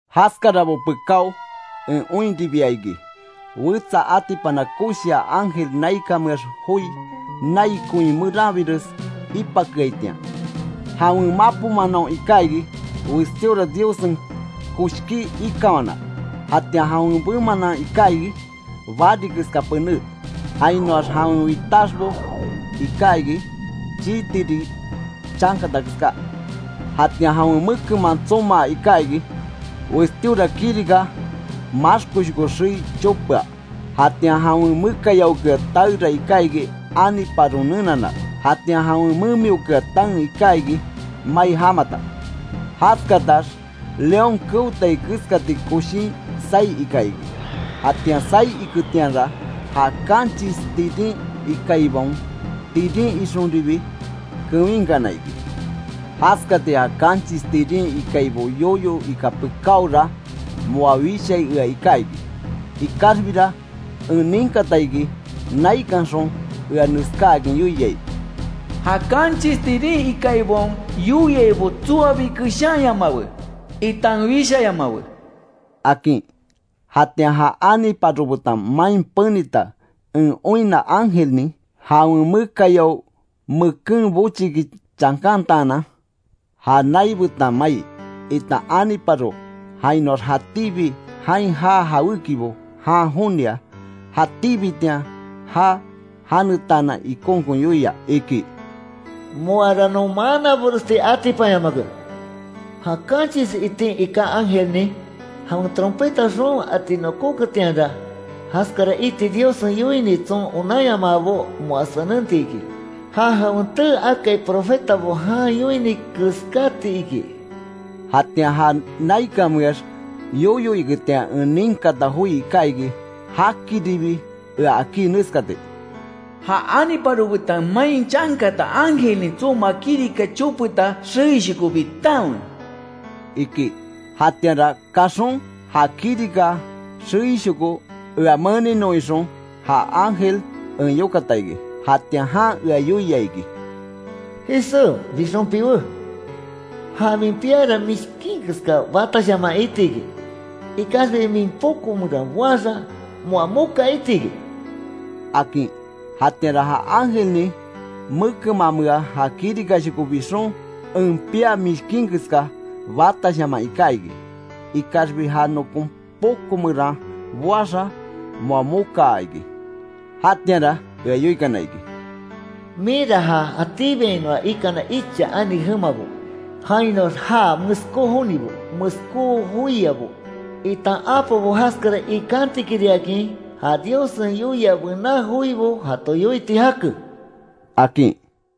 Jaskarabo pekáo en oinribia iki, wetsa atipana koshia ángel naikanmeax joí, nai koin meranbires ipakeaitian. Jawen mapo manaon iká iki, westíora Diossen koshkí ikanwana. Jatian jawen bemanan iká iki, bari keska pené. Jainoax jawen witaxbo iká iki, chii tiri chankata keská, Jatian jawen mekenman tsomaa iká iki; westíora kirika maxkoshoko xei chopea. Jatian jawen mekayaokea taera iká iki aniparon nenana. Jatian jawen memiokea taen iká iki mai jamata. Jaskatax león keotai keskati koshin saí ika iki, jatian saí iketianra; ja kanchis tirin ikaibaon tirin ixonbiribi kewinkana iki. Jaskati ja kanchis tirin ikaibo yoyo ika pekáora moa wishai ea iká iki. Ikaxbira en ninkata iki, naikanxon ea neskáakin yoiai: “Ja kanchis tirin ikaibaon yoiaibo tsoabi keshanyamawe, itan wishayamawe”, akin. Jatian ja aniparo betan main penita en oinna ángelnin, jawen mekayao meken bochiki chankantaanan, ja nai betan mai, itan aniparo jainoax jatíbi jain jaa jawékibo jan jonia; jatíbitian jaa janetaanan ikonkon yoia iki: “Moara non manaboresti atipanyamake, ja kanchis itin iká ángelnin jawen trompeta xoon ati nokóketianra, jaskara iti Diossen yoini tson onanyamaabo moa senenti iki. Ja jawen tee akai profetabo jan yoini keskati”, iki. Jatian ja naikanmeax yoyo iketian en ninkata joi iká iki, jakiribi ea akí neskati: “Ja aniparo betan main chankata ángelnin tsomaa kirika chopeta xeishoko bitanwe”, iki. Jatianra kaxon ja kirika xeishoko ea meninon ixon ja ángel en yokata iki. Jatian jan ea yoia iki: “Jisé, bixon piwé. Ja min piara mishkin keska batashaman iti iki. Ikaxbi min poko meran boaxa moa moka iti iki”, akin. Jatianra ja ángelnin mekenmamea ja kirikashoko bixon en piá mishkin keska batashaman iká iki, ikaxbi ja nokon poko meran boaxa, moa mokaa iki. Jatianra ea yoikana iki: “Minra ja jatíbiainoa ikana icha ani jemabo, jainoax ja meskó jonibo, meskó joiabo itan apobo jaskara ikantikiriakin ja Diossen yoia bená joibo jato yoiti jake”, akin.